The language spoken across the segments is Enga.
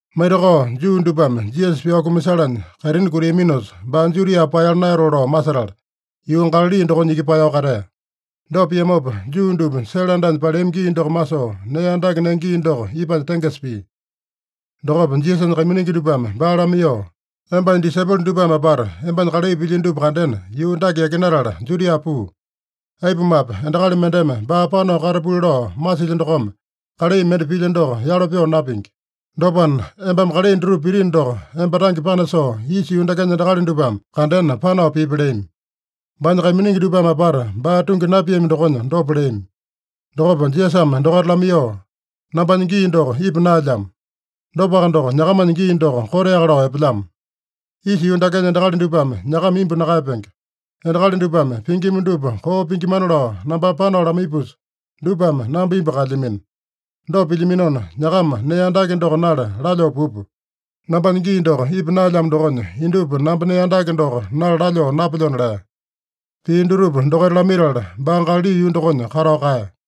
Maitakao Juu dupame Jisasa pyao kumasalanya kaitini kutiaminosa, baa Judia paeyala naeyatoo lao masetala, yuu Galali dokonya iki paeyao katea. Dopa piamopa Juu dupa sele andanya paleami gii doko masoo nee andake nenge gii doko ipanya tengesa pia. Dokopa Jisasanya kaiminingi dupame baa lamaiyoo, “Embanya disaipolo dupame apata embanya kalai pilyino dupa kandena, yuu dake yakinatala Judia puu. Aipumape, endakali mendeme baa panao katapuli lao masilya dokome kalai mende pilya doko yalo pyoo napingi. Dopana, embame kalai dutupa pitino doko, emba tange panasoo isa yuu dakenya endakali dupame kandena panao pipi” leami. (Baanya kaiminingi dupame apata baa tungi napiami dokonya dopa leami.) Dokopa Jisasame dokaita lamaiyoo, “Nambanya gii doko ipa naelyamo. Dopaka doko, nyakamanya gii doko koteaka lao epelyamo. Isa yuu dakenya endakali dupame nyakama imbu nakaeyapenge. Endakali dupame pingima dupa koo pingimana lao nambame panao lamaipusa, dupame namba imbu kaelyamino. Dopa pilyaminona, nyakama nee andake doko nala lalyoo pupa. Nambanya gii doko ipa naelyamo dokonya, indupa namba nee andake doko nala lalyoo napelyona” lea. Pii dutupa dokaita lamaitala, baa Galali yuu dokonya katao kaeya.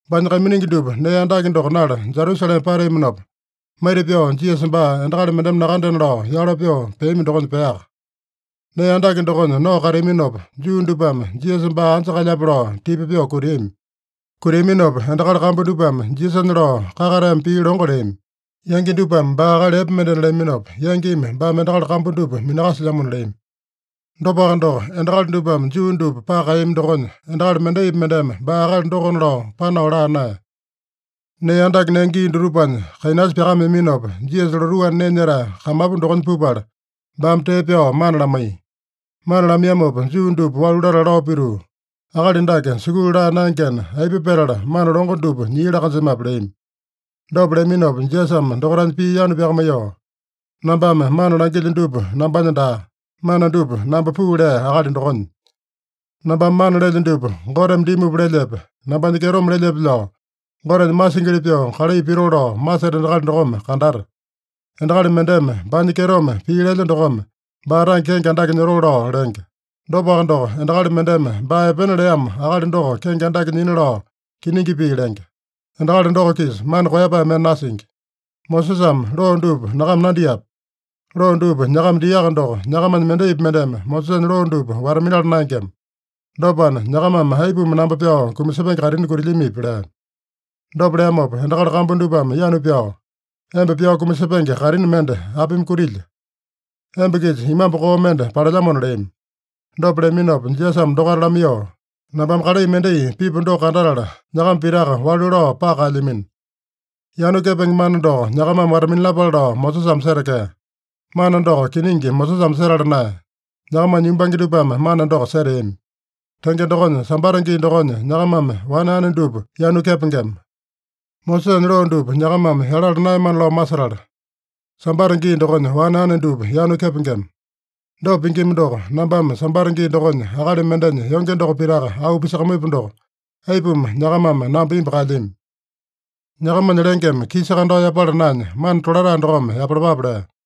Baanya kaiminingi dupa nee andake doko nala Jerusalema pateaminopa, maita-pyao Jisasa baa endakali mendeme nakandena lao yalo pyoo peami dokonya peaka. Nee andake dokonya nao kateaminopa, Juu dupame Jisasa baa anja kalyape lao tipa pyoo kutiami. Kutiaminopa endakali kambu dupame Jisasanya lao kakateame pii longo leami. Yangi dupame baa akali epe mendena leaminopa, yangimi baame endakali kambu dupa minakasilyamona leami. Dopaka doko, endakali dupame Juu dupa paka kaeyami dokonya, endakali mendaipi mendeme baa akali dokona lao, panao laa naeya. Nee andake nenge gii dutupanya kainasa pyakameaminopa, Jisasa lotuu anda nee nyetae kamapu dokonya pupala, baame tee pyao mana lamaiya. Mana lamaiyamopa Juu dupa walu latala lao pituu, “Akali dake sukulu laa naengena, aipa petala mana longo dupa nyia laa-kanjemape?” leami. Dopa leaminopa Jisasame dokaitanya pii yanu pyakamaiyoo, “Nambame mana langilyo dupa nambanya daa. Mana dupa namba puu lea Akali dokonya. Nambame mana lelyo dupa Goteme dimupa lelyepe, nambanya kyetome lelyepe lao, Gotenya masingili pyoo kalai pitoo lao maseta endakali dokome kandata. Endakali mendeme baanya kyetome pii lelya dokome, baa tange kenge andake nyotoo lao lenge. Dopaka doko, endakali mendeme baa epena leamo akali doko kenge andake nyina lao kiningi pii lenge. Endakali doko-kisa mana koeyapae mende nasingi. Mosesame loo dupa nyakama nandiape? Loo dupa nyakama diaka doko, nyakamanya mendaipi mendeme Mosesanya loo dupa wata-minala naengema. Dopana, nyakamame aipuma namba pyao kumasepenge kaitini kutilyamipi?” lea. Dopa leamopa endakali kambu dupame yanu pyao, “Emba pyao kumasepenge kaitini mende apimi kutilya? Emba-kisa imambu koo mende palelyamona” leami. Dopa leaminopa Jisasame dokaita lamaiyoo, “Nambame kalai mendai pipu doko kandatala, nyakama pitaka walu lao paka kaelyamino. Yanu kepenge mana doko nyakamame wata-minalapale lao Mosesame setekea. (Mana doko kiningi Mosesame setala naeya. Nyakamanya yumbange dupame mana doko seteami.) Tenge dokonya, Sambata gii dokonya nyakamame wane ane dupa yanu kepengema. Mosesanya loo dupa nyakamame yalala naeyamana lao masetala, Sambata gii dokonya wane ane dupa yanu kepengema. Dopa pingima doko, nambame Sambata gii dokonya akali mendenya yonge doko pitaka auu pisakamaipu doko, aipuma nyakamame namba imbu kaelyami? Nyakamanya lengeme kisa kandao yapala naenya, mana tolatae dokome yapalapape” lea.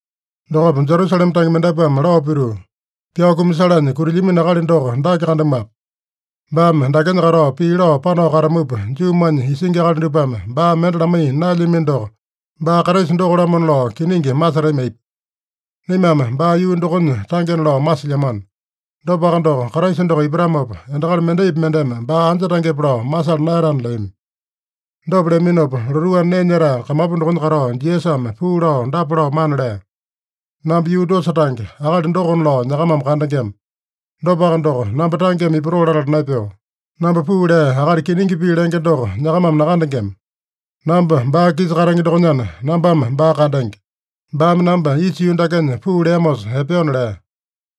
Dokopa Jerusalema tange mendapuame lao pituu, “Pyao kumasalanya kutilyamino akali doko dake kandamuape? Baame dakenya katao pii lao panao katamupa, Juumanya isingi akali dupame baa mende lamaiya naelyamino doko, baa Kraisa doko-lamona lao kiningi masetami aipa? Naimame baa yuu dokonya tangena lao masilyamano. Dopaka doko, Kraisa doko ipatamopa, endakali mendaipi mendeme baa anja tangepe lao masala naeyatana” leami. Dopa leaminopa, lotuu anda nee nyetae kamapu dokonya katao Jisasame puu lao dapa lao mana lea: “Namba yuu dosa tange, akali dokona lao nyakamame kandengema. Dopaka doko, namba tangeme ipatoo latala naepeo. Namba puu lea Akali kiningi pii lenge doko nyakamame nakandengema. Namba baa-kisa katenge dokonyana, nambame baa kandenge. Baame namba isa yuu dakenya puu leamosa epeona” lea.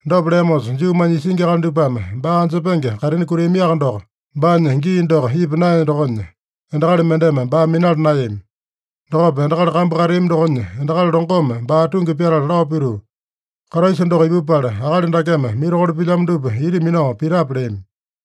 Dopa leamosa Juumanya isingi akali dupame baa anjepenge kaitini kutiamiaka doko, baanya gii doko ipa naeya dokonya, endakali mendeme baa minala naeyami. Dokopa endakali kambu kateami dokonya endakali longome baa tungi pyatala lao pituu, “Kraisa doko ipupala, akali dakeme mirakolo pilyamo dupa ita minao pitape?” leami.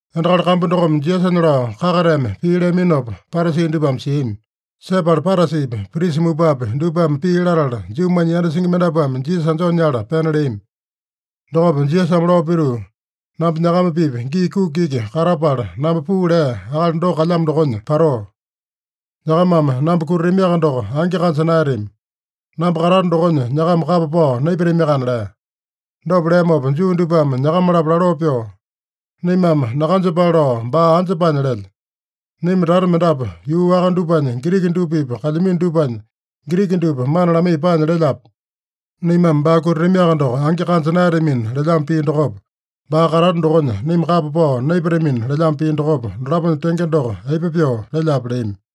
Endakali kambu dokome Jisasanya lao kakateame pii leaminopa, Parasi dupame siami. Sepala Parasipi, prisa mupapi dupame pii latala, Juumanya yanda singi mendapuame Jisasa anjoo nyala pena leami. Dokopa Jisasame lao pituu, “Namba nyakama-pipa gii kuki iki katapala, namba puu lea Akali doko kalyamo dokonya patoo. Nyakamame namba kutatamiaka doko, angi kanja naeyatami. Namba katato dokonya nyakama kapa pao naipatamiakana” lea. Dopa leamopa Juu dupame nyakama-lapo laloo pyoo, “Naimame nakanjepale lao baa anja paanya lelya? Naima tata mendapu yuu waka dupanya Giriki dupa-pipa kalyamino dupanya, Giriki dupa mana lamaiya paanya lelyape? Naimame baa kutatamiaka doko angi kanja naeyatamina lelyamo pii dokopa, baa katato dokonya naima kapa pao naipatamina lelyamo pii dokopa, dolaponya tenge doko aipa pyoo lelyape?” leami.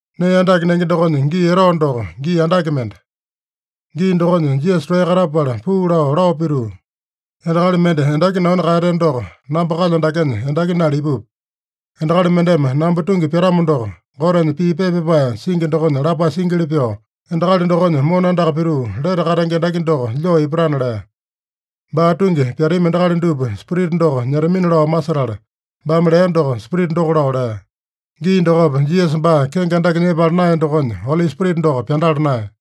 Nee andake nenge dokonya gii etao doko, gii andake mende. Gii dokonya Jisasa toeya katapala puu lao, lao pituu, “Endakali mende endaki nanu kaeyateno doko, namba kalyo dakenya endaki nala ipupi. Endakali mendeme namba tungi pyatamo doko, Gotenya pii pepa pyapae singi dokonya lapae singili pyoo, ‘Endakali dokonya mona andaka pituu, lete katenge endaki doko lyoo ipatana’” lea. Baa tungi pyatami endakali dupa Spirita doko nyetamina lao masetala, baame lea doko Spirita doko lao lea. Gii dokopa Jisasa baa kenge andake nyepala naeya dokonya, Oli Spirita doko pyandala naeya.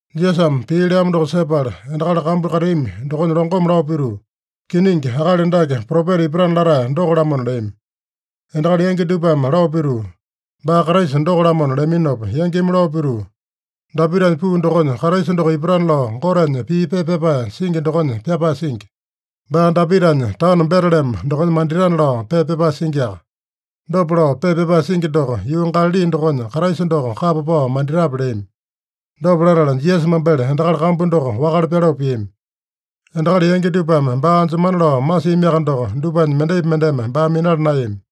Jisasame pii leamo doko sepala, endakali kambu kateami dokonya longome lao pituu, “Kiningi, akali dake Propeta ipatana latae doko-lamona” leami. Endakali yangi dupame lao pituu, “Baa Kraisa doko-lamona” leaminopa, yangimi lao pituu, “Dapitanya puu dokonya Kraisa doko ipatana lao Gotenya pii pepa pyapae singi dokonya pyapae singi. Baa Dapitanya taono Betelema dokonya manditana lao pepa pyapae singiaka. Dopa lao pepa pyapae singi doko, yuu Galali dokonya Kraisa doko kapa pao manditape?” leami. Dopa latala, Jisasa mambele endakali kambu doko wakale pyaloo piami. Endakali yangi dupame baa anjemana lao masiamiaka doko, dupanya mendaipi mendeme baa minala naeyami.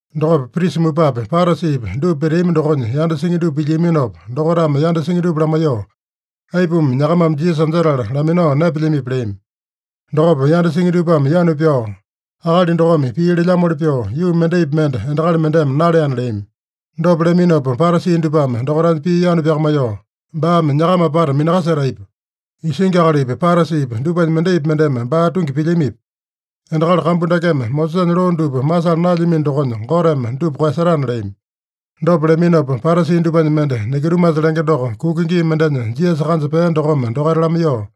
Dokopa prisa mupapi, Parasipi dupa peteami dokonya yanda singi dupa pilyiaminopa, dokaitame yanda singi dupa lamaiyoo, “Aipuma nyakamame Jisasa anjetala laminao naepelyamipi?” leami. Dokopa yanda singi dupame yanu pyao, “Akali dokome pii lelyamoli pyoo, yuu mendaipi mende endakali mendeme naleana” leami. Dopa leaminopa Parasi dupame dokaitanya pii yanu pyakamaiyoo, “Baame nyakama apata minakaseta aipa? Isingi akalipi, Parasipi dupanya mendaipi mendeme baa tungi pilyamipi? Endakali kambu dakeme Mosesanya loo dupa masala naelyamino dokonya, Goteme dupa koeyasetana” leami. Dopa leaminopa Parasi dupanya mende, Nikodimasa lenge doko, kuka gii mendenya Jisasa kanja pea dokome dokaita lamaiyoo,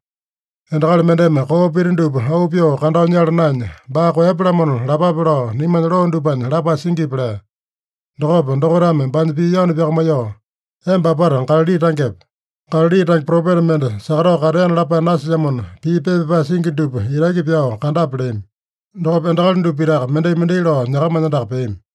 “Endakali mendeme koo pita dupa auu pyoo kandao nyala naenya, baa koeyapya-lamona lapape lao naimanya loo dupanya lapae singipi?” lea. Dokopa dokaitame baanya pii yanu pyakamaiyoo, “Emba apata Galali tangepe? Galali tange propeta mende sakatao kateana lapae nasilyamona, pii pepa pyapae singi dupa itaki pyao kandape” leami. Dokopa endakali dupa pitaka mendai-mendai lao nyakamanya andaka peami.